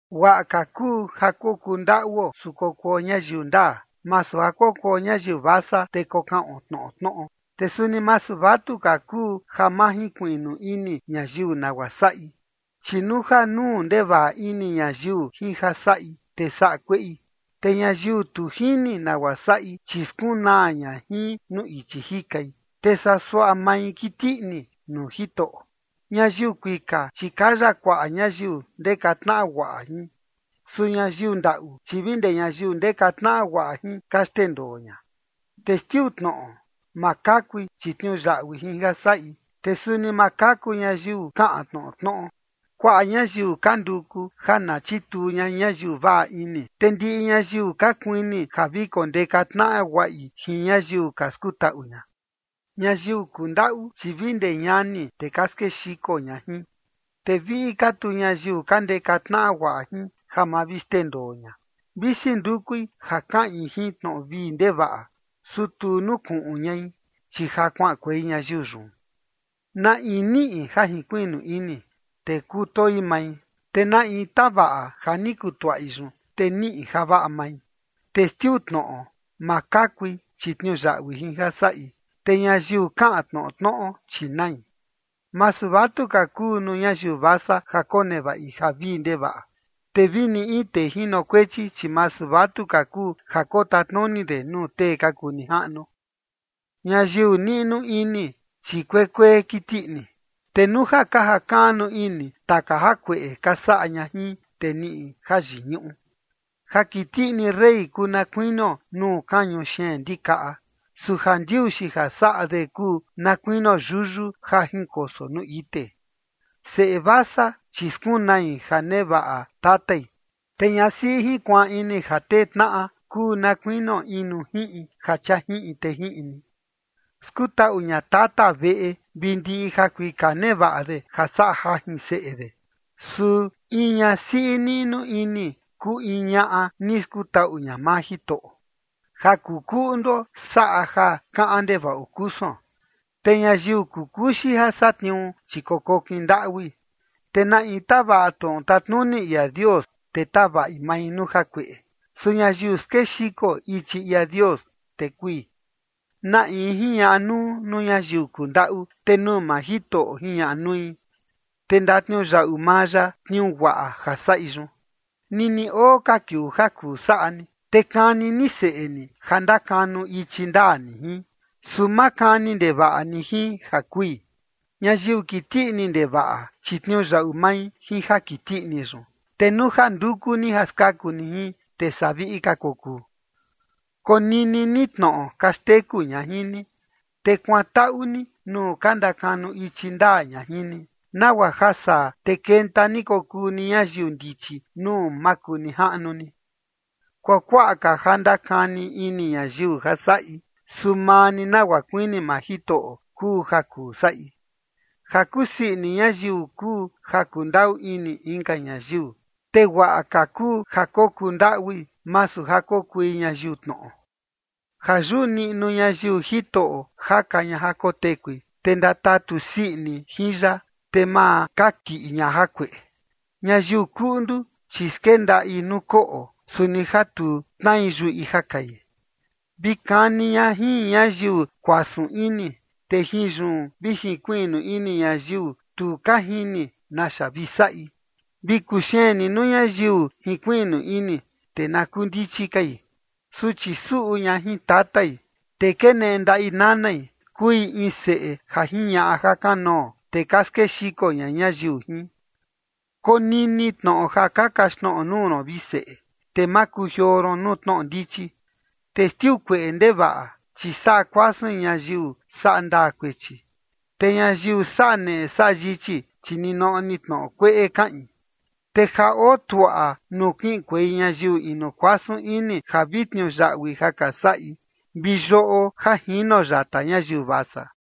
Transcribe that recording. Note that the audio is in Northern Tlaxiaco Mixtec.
Guaꞌa ka kuu ja kokuu ndaꞌuo su kokuo ñayiu ndaa, masu ja kokuo ñayiu vasa, te kokaꞌon tnoꞌo tnoꞌo. Te suni masu vatuka kuu ja ma jinkuiꞌnu ini ñayiu nagua saꞌi, chi nuu ja nuu ndevaꞌa ini ñayiu jin ja saꞌi, te saꞌa kueꞌi. Te ñayiu tu jini nagua saꞌi, chi skunaa ña jin nuu ichi jikai, te saa suaꞌa mai kiti ini nuu Jitoꞌo. Ñayiu kuika, chi kaya kuaꞌa ñayiu ndeka tnaꞌa guaꞌa jin. Su ñayiu ndaꞌu, chi vi ndee ñayiu ndeka tnaꞌa guaꞌa jin, ka xndendoo ña. Testiu tnoꞌo, ma kakui, chi tniuyaꞌui jin ja saꞌi, te suni ma kaku ñayiu kaꞌan tnoꞌo tnoꞌo. Kuaꞌa ñayiu ka nduku ja na chituu ña ñayiu vaꞌa ini, te ndiꞌi ñayiu ka kuini ja vi kondeka tnaꞌa guaꞌi jin ñayiu ka skutaꞌu ña. Ñayiu kundaꞌu, chi vi ndee ñani, te ka skexiko ña jin, te viꞌi ka tu ñayiu ka ndeka tnaꞌa guaꞌa jin ja ma vi xndendoo ña. Visi ndukui ja kaꞌin jin tnoꞌo vii ndevaꞌa, su tu nukuꞌun ñai, chi ja kuaꞌankuei ñayiu yun. Na in niꞌi ja jinkuiꞌnu ini, te kutoi mai. Te na in tavaꞌa ja ni kutuaꞌi yun, te niꞌi javaꞌa mai. Testiu tnoꞌo, ma kakui, chi tniuyaꞌui jin ja saꞌi. Te ñayiu kaꞌan tnoꞌo tnoꞌo, chi nai. Masu vatuka kuu nuu ñayiu vasa ja konevaꞌi ja vii ndevaꞌa, te vini in tee jinokuechi, chi masu vatuka kuu ja kotatnuni de nuu tee ka kuu nijaꞌnu. Ñayiu niꞌnu ini, chi kuekuee kiti ini, te nuu ja jakaꞌnu ini taka jakueꞌe ka saꞌa ña jin, te niꞌi jayiñuꞌu. Ja kiti ini rey kuu na kuinio nuu kañu xeen ndikaꞌa. Su jandiuxi ja saꞌa de kuu na kuinio yuyu ja jinkoso nuu ite. Seꞌe vasa, chi skunai ja nevaꞌa tatai, te ñasiꞌi jinkuaan ini ja tee tnaꞌa kuu na kuinio in nuu jiꞌin ja chia jiꞌin te jiꞌin ni. Skutaꞌu ña tata veꞌe vi ndiꞌi jakuika nevaꞌa de ja saꞌa jajin seꞌe de. Su in ñasiꞌi niꞌnu ini kuu in ñaꞌa ni skutaꞌu ña maa Jitoꞌo. Ja kuu kuꞌnduo saꞌa ja kaꞌan ndevaꞌo kusuon, te ñayiu kuu kuxi ja satniuu, chi kokokin ndaꞌui. Te na in tavaꞌa tnoꞌo tatnuni ia Dios, te tavaꞌi mai nuu jakueꞌe. Su ñayiu skexiko ichi ia Dios, te kui. Na in jiñaꞌa nuu, nuu ñayiu kundaꞌu, te nuu maa Jitoꞌo jiñaꞌa nui, te ndatniuyaꞌu maa ya tniuu guaꞌa ja saꞌi yun. Nini oo ka kiuu ja kuu saꞌa ni, te kani ni seꞌe ni ja ndakanu ichi ndaa ni jin. Su ma kani ndevaꞌa ni jin ja kui. Ñayiu kiti ini ndevaꞌa, chi tniuyaꞌu mai jin ja kiti ini yun. Te nuu ja nduku ni ja skaku ni jin, te saa viꞌi ka kokuu. Konini ni tnoꞌo ka xteku ña jin ni, te kuantaꞌu ni nuu ka ndakanu ichi ndaa ña jin ni, nagua ja saa, te kenta ni kokuu ni ñayiu ndichi nuu makunijaꞌnu ni. Kuakuaꞌa ja ndakani ini ñayiu ja saꞌi, su maa ni nagua kuini maa Jitoꞌo kuu ja kuu saꞌi. Ja kusii ini ñayiu kuu ja kundaꞌu ini inka ñayiu, te guaꞌa ka kuu ja kokuu ndaꞌui, masu ja kokui ñayiu tnoꞌo. Ja yuꞌu niꞌnu ñayiu Jitoꞌo jaka ña ja kotekui, te ndatatu sii ini jin ya, te ma kakiꞌi ña jakueꞌe. Ñayiu kuꞌndu, chi skendaꞌi nuu koꞌo, su ni ja tu tnai yuꞌi ja kai. Vi kani ña jin ñayiu kuasun ini, te jin yun vi jinkuiꞌnu ini ñayiu tu ka jini naxa vi saꞌi, vi kuxeen ni nuu ñayiu jinkuiꞌnu ini, te na kuu ndichi kai. Suchi suꞌu ña jin tatai, te keneꞌe ndaꞌi nanai, kuu in seꞌe ja jiñaꞌa jakanoo, te ka skexiko ña ñayiu jin. Konini tnoꞌo ja ka kaxtnoꞌo nuu ron, vi seꞌe, te ma kujioo ron nuu tnoꞌo ndichi. Testiu kueꞌe ndevaꞌa, chi saꞌa kuasuin ñayiu saꞌa ndaa kuechi, te ñayiu saꞌa neꞌe saꞌa yichi, chi ninoꞌo ni tnoꞌo kueꞌe kaꞌin. Te ja oo tuaꞌa nuu kiꞌinkuei ñayiu inu kuasun ini ja vi tniuyaꞌui ja ka saꞌi, vi yoꞌo ja jino yata ñayiu vasa.